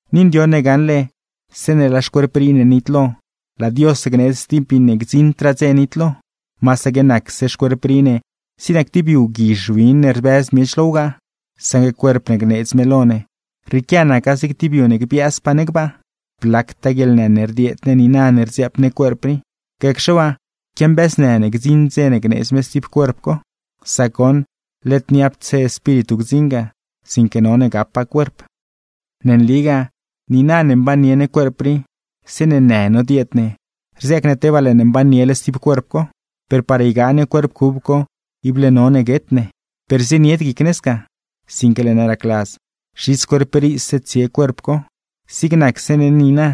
Ni ndioṉ ne gaṉle, zeeṉe laa xcuerp rii ne nitlo, laa Dios gneedz stib miṉe gdziṉdraa dze nitlo. Masaque nacse xcuerp rii ne zig nac tib yu guizh win ne rbëz miech lo wgaa; saṉgue cuerp ne gneedz me lo ne, rrieequia naca zig tib yu ne gbiaazpaa ne gbaa. ¡Blactaa guieḻnë ne rdieed ne niina ne rdziaap ne cuerp rii! Gacxe waa, quiambiaaznë ne gdziṉ dze ne gneedz me stib cuerp co. Sac goṉ, led niapdse espíritu gdziṉ ga, sinque none gapa cuerp. Ne nligaa, niina ne mbannie ne cuerp rii, zeeṉe në nodieed ne, rziaac ne tebaa laa ne mbanniele stib cuerp co. Per par ygaa ne cuerp cub co, ible none guet ne. Per zienied guic ne sca, sinque laa ne racladz zhits cuerp riise tsie cuerp co, zig nacse ne niina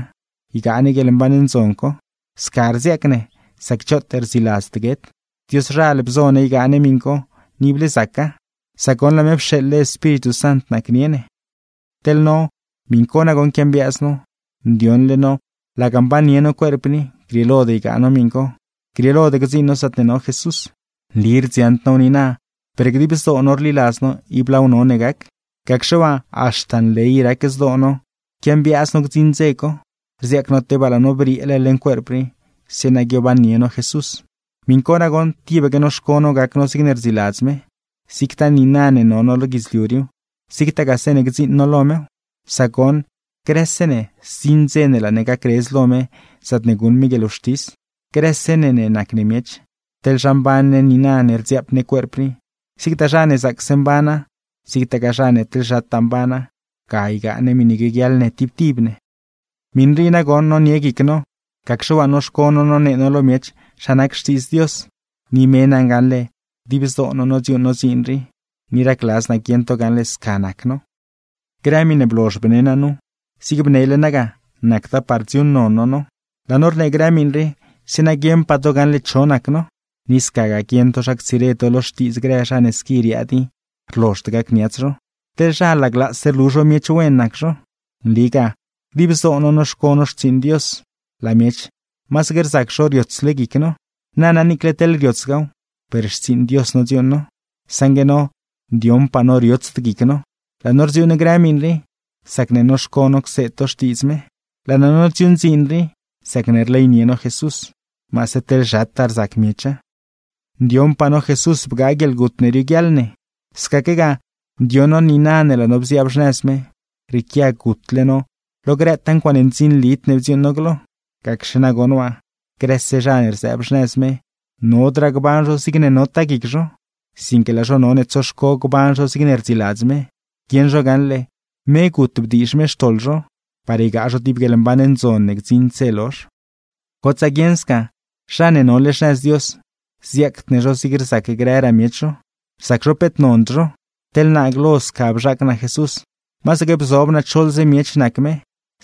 ygaa ne guieḻmban ndzon co. Sca rziaac ne, sac choot rdziladzd guet. Dioszhal bzo ne ygaa ne miṉ co, ni ible zaca, sac goṉ laa me pxeeḻle Espíritu Sant nacnie ne. Teḻ no, miṉ co nagoṉ quiambiaaz no; ndioṉle no laga mbannie no cuerp rii, grieelod ygaa no miṉ co, grieelod gdziiṉ no zaatne no Jesús. Nli rdziaṉd now niina, per dib zdoo no rliladz no ib laaw none gac. Gacxe waa, haxta nley rac zdoo no quiambiaaz no gdziṉ dze co; rziaac no tebaa laa no brieele leṉ cuerp rii, zeeṉa guiobannie no Jesús. Miṉ co nagoṉ, tibaque noxco no gac no zigne rdziladz me, zigtaa niina ne no no lo guidzliu riiw, zigtagaa zeeṉe gdziiṉ no lo mew. Sac goṉ, grëse ne zdziṉ dze ne laa ne gacredz lo me zaatne guṉ me guieḻwxtis. Grëse ne ne nac ne miech, teḻ zha mban ne niina ne rdziaap ne cuerp rii: zigtaa zha ne zaacse mbana, zigtagaa zha ne teḻ zhataa mbana, ga ygaa ne miṉe guioguiaḻ ne tib tib ne. Miṉ rii nagoṉ nonie guic no, gacxe waa noxco no nonee no lo miech zha nac Xtiidz Dios. Ni me naṉ gaṉle dib zdoo no nodziuuṉ no dziin rii, ni racladz naa guieṉ to gaṉle sca nac no. Grë miṉe blozh bne naa nu, zig bnele naa ga: nacda par dziuuṉnon no no. Laa no rnee grë miṉ rii, zeeṉa guieṉpaa to gaṉle cho nac no; ni scagaa, guieṉ to zha ctsire to lo xtiidz grë zha ne squi riaad i rlozhd gacniats zho. Teḻ zha, laglaase rlu zho miech wen nac zho. Nligaa, dib zdoo no noxco no xtsiiṉ Dios, laa miech masaque rzac zho riotsle guic no. Nana niicle teḻ riotsgaaw, per xtsiiṉ Dios nodziuuṉ no. Saṉgue no, ndioṉpaa no riotsd guic no; laa no rdziuuṉ grë miṉ rii, sacne noxco no cseed to Xtiidz me. Laa no nodziuuṉ dziin rii, sacne rleynie no Jesús, maase teḻ zhataa rzac miecha. Ndioṉpaa no Jesús bgaa guieḻgut ne nioguiaḻ ne; scaquegaa, ndioṉ no niina ne laa no bziaab xnëz me, rrieequia gutle no lo grëtaa ncuaaṉe ndzinlid ne bdziuuṉ no glo. Gacxe nagoṉ waa, grëse zha ne rzëëb xnëz me, nodraa gban zho zigne notaa guic zho, sinque laa zho none tsoxco gban zho zigne rdziladz me; guieṉ zho gaṉle, me gut bdiizh me xtoḻ zho (ni brieeban me), par ygaa zho tib guieḻmban ndzon ne gdziṉd dze lozh. Gotsaa guieṉ sca, zha ne nole xnëz Dios, ziaacd ne zho zig rzac grëraa miech zho, rzac zho peet nond zho. Teḻ naa glo sca bzhaac naa Jesús, masaque bzob naa choḻze miech nac me;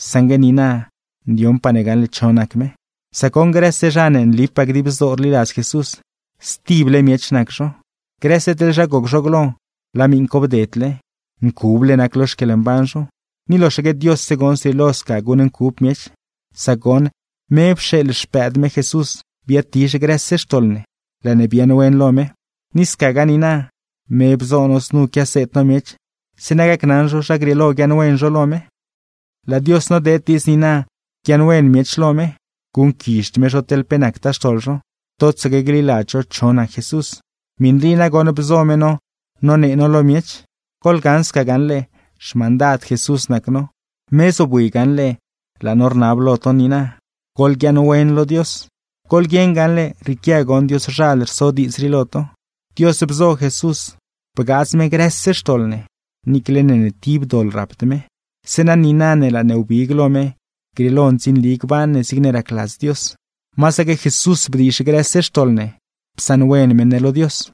saṉgue niina, ndioṉpaa ne gaṉle cho nac me. Sac goṉ, grëse zha ne ne nlipaa dib zdoo rliladz Jesús, stible miech nac zho. Grëse teḻ zha goc zho glo, laa miṉ co bdedle. ¡Ncuble nac lo xquieḻmban zho! Ni loxaque Diosse goṉ zrieelo sca guṉncub miech. Sac goṉ, me pxeeḻ Xpëëd me Jesús biaadtizh grëse xtoḻ ne, laa ne biaaṉwen lo me. Ni scagaa niina, me bzo no znu quiaseed no miech, zeeṉa gacnaṉ zho zha grieelo guiaaṉwen zho lo me. Znu goṉ naca: Laa Dios nodeed diidz niina guiaaṉwen miech lo me, guṉquizhd me zho teḻ pe nactaa xtoḻ zho, totsaque gliladz zho cho nac Jesús. Miṉ rii nagoṉ bzo me no nonee no lo miech. Goḻgaṉ sca gaṉle, xmandad Jesús nac no. Me zobwi gaṉle laa no rnab lo to niina: ¡Goḻguiaaṉwen lo Dios! Goḻguieṉ gaṉle, rrieequia goṉ Dioszhal rso diidz rii lo to. Sac goṉ, Dios bzo Jesús bgaadz me grëse xtoḻ ne, niicle ne ni tib doḻ rapd me; zeeṉa niina ne laa ne wbig lo me, grieelo ndzinli gban ne, zigne racladz Dios. ¡Masaque Jesús bdiizh grëse xtoḻ ne, psaṉwen me ne lo Dios!